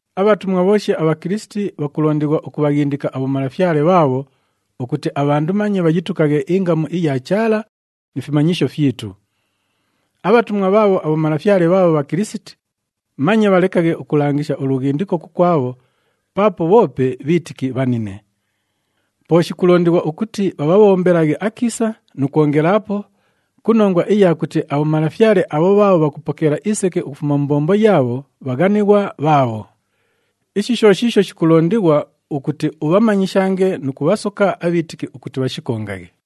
Abhatumwa bhooshi aBhakilisiti bhakulondighwa ukubhaghindika abhomalafyale bhaabho ukuti abhandu manye bhayitukaghe ingamu iya Chaala ni fimanyisho fyitu. Abhatumwa bhaabho abhomalafyale bhaabho Bhakilisiti, manye bhalekaghe ukulangisha ulughindiko kukwabho paapo bhoope bhiitiki bhanine. Po shikulondighwa ukuti bhabhabhombelaghe akiisa nu kwongelaapo ku nongwa iya kuti abhomalafyale abho bhaabho bhakupokeela iseke ukufuma mu mbombo yaabho bhaghanighwa bhaabho. Ishi sho shiisho shikulondighwa ukuti ubhamanyishange nu kubhasoka abhiitiki ukuti bhashikongaghe.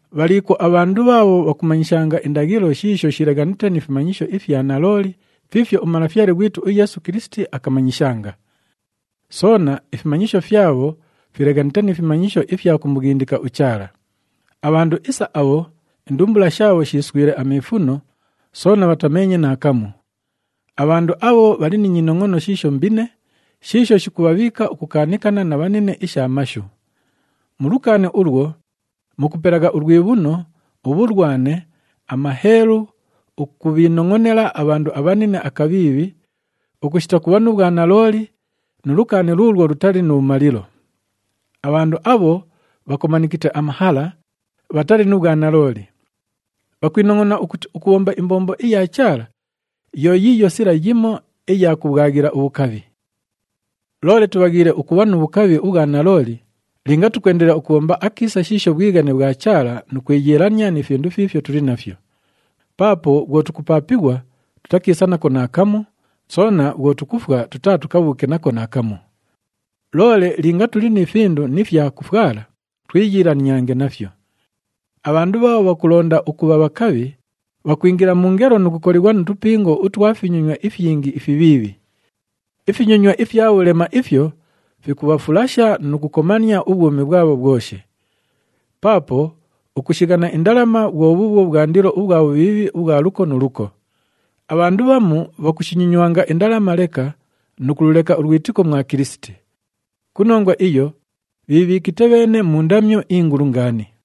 Bhaliikwo abhandu bhaabho bhakumanyishanga indaghilo shiisho shileghanite ni fimanyisho ifya nalooli fiifyo uMalafyale ghwitu uYeesu Kilisiti akamanyishanga. Soona, ifimanyisho fyabho fileghanite ni fimanyisho ifya kumughindika uChaala. Abhandu isa abho, indumbula shaabho shiiswile amiifuno soona bhatameenye naakamu. Abhandu abho bhali ni nyinongʼono shiisho mbine, shiisho shikubhabhiika ukukaanikana na bhanine isha mashu. Mu lukaani ulwo, mukupelagha ulwibhuno, ubhulwane, amaheelu, ukubhiinongʼonela abhandu abhanine akabhiibhi, ukushita kubha nu bhwanalooli nu lukaani luulwo lutali nu bhumalilo. Abhandu abho bhakomanikite amahala, bhatali nu bhwanalooli. Bhakwinongʼonagha ukuti ukubhomba imbombo iya Chaala, yo yiiyo sila yimo iya kubhwaghila ubhukabhi. Loole tubhaghiile ukubha nu bhukabhi ubhwa nalooli linga tukwendelela ukubhomba akiisa shiisho bhwighane bhwa Chaala nu kwiyiilania ni findu fiifyo tuli nafyo. Paapo bhwo tukupaapighwa, tutakiisa nako naakamu, soona bhwo tukufwa, tutaatukabhuuke nako naakamu. Loole linga tuli ni findu ni fyakufwala, twiyiilaniange nafyo. Abhandu bhaabho bhakulonda ukubha bhakabhi, bhakwingila mu ngelo nu kukolighwa mu tupingo utwa finyonywa ifyingi ifibhiibhi. Ifinyonywa ifya bhulema ifyo fikubhafulasha nu kukomania ubhwumi bhwabho bhwoshi. Paapo ukushighana indalama bhwo bhuubhwo bhwandilo ubhwa bhubhiibhi ubhwa luko nu luko. Abhandu bhamu bhakushinyonywanga indalama leka nu kululeka ulwitiko mwa Kilisiti. Ku nongwa iyo, bhiibhiikite bheene mu ndamyo ingulu ngaani.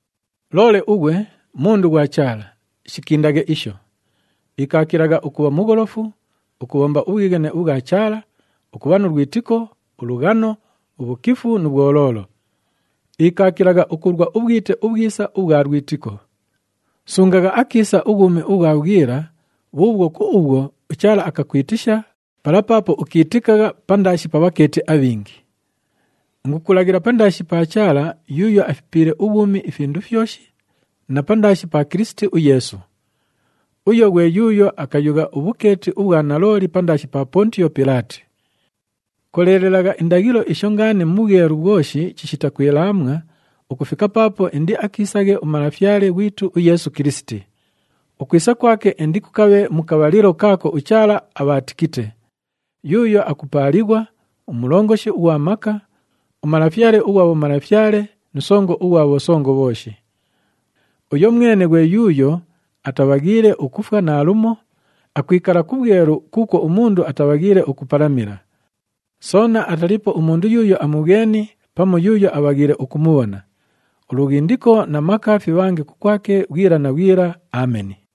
Loole ughwe, mundu ghwa Chaala, shikindaghe isho. Ikaakilagha ukubha mugholofu, ukubhomba ubhwighane ubhwa Chaala, ukubha nu lwitiko, ulughano, ubhukifu nu bhwoloolo. Ikaakilagha ukulwa ubhwite ubhwisa ubhwa lwitiko. Sungagha akiisa ubhwumi ubhwa bhwila bhuubhwo ku ubhwo, uChaala akakwitisha pala paapo ukiitikagha pandaashi pa bhakeeti abhingi. Ingukulaghila pandaashi pa Chaala yuuyo afipiile ubhwumi ifindu fyoshi na pandaashi pa Kilisiti uYeesu. Uyo ghwe yuuyo akayugha ubhukeeti ubhwa nalooli pandaashi pa Pontiyo Pilaati. Koleelelagha indaghilo isho ngaani mu bhwelu bhwoshi chishita kwilaamwa ukufika paapo indiakiisaghe uMalafyale ghwitu uYeesu Kilisiti. Ukwisa kwake indikukabhe mu kabhalilo kaako uChaala abhaatikite, yuuyo akupaalighwa, uMulongoshi ughwa maka, uMalafyale ughwa bhomalafyale nu Songo ughwa bhosongo bhooshi. Uyo mwene ghwe yuuyo atabhaghiile ukufwa naalumo, akwikala ku bhwelu kuukwo umundu atabhaghiile ukupalamila. Soona ataliipo umundu yuuyo amubhweni pamu yuuyo abhaghiile ukumubhona. Ulughindiko na maka fibhange kukwake bhwila na bhwila. Ameni.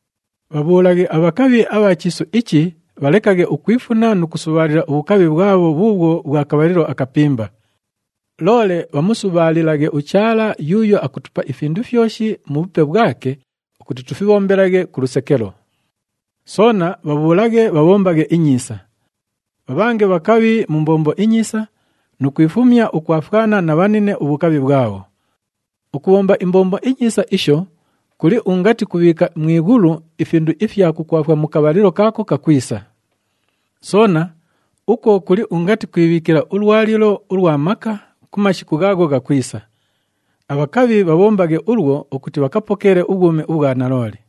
Bhabhuulaghe abhakabhi abha chiisu ichi bhalekaghe ukwifuna nu kusubhaalila ubhukabhi bhwabho bhuubhwo bhwa kabhalilo akapimba. Loole bhamusubhaalilaghe uChaala yuuyo akutupa ifindu fyoshi mu bhupe bhwake ukuti tufibhombelaghe ku lusekelo. Soona bhabhuulaghe bhabhombaghe inyiisa. Bhabhange bhakabhi mu mbombo inyiisa nu kwifumya ukwafwana na bhanine ubhukabhi bhwabho. Ukubhomba imbombo inyiisa isho kuli ungati kubhiika mu ighulu ifindu ifya kukwafwa mu kabhalilo kaako kakwisa. Soona, ukwo kuli ungati kwibhiikila ulwalilo ulwa maka ku mashiku ghaagho ghakwisa. Abhakabhi bhabhombaghe ulwo ukuti bhakapokeele ubhwumi ubhwa nalooli.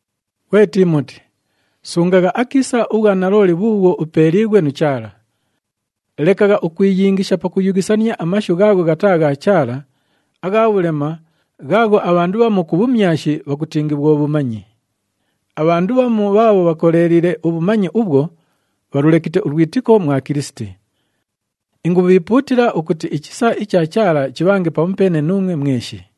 Ghwe Tiimoti, sungagha akiisa ubhwanalooli bhuubhwo upeeliighwe nu Chaala. Lekagha ukwiyingisha pakuyughisania amashu ghaagho ghataa gha Chaala, agha bhulema, ghaagho abhandu bhamu ku bhumyashi bhakutingi bhwo bhumanyi. Abhandu bhamu bhaabho bhakoleeliile ubhumanyi ubhwo, bhalulekite ulwitiko mwa Kilisiti. Ingubhiipuutila ukuti ichisa icha Chaala chibhange pamupeene nuumwe mweshi.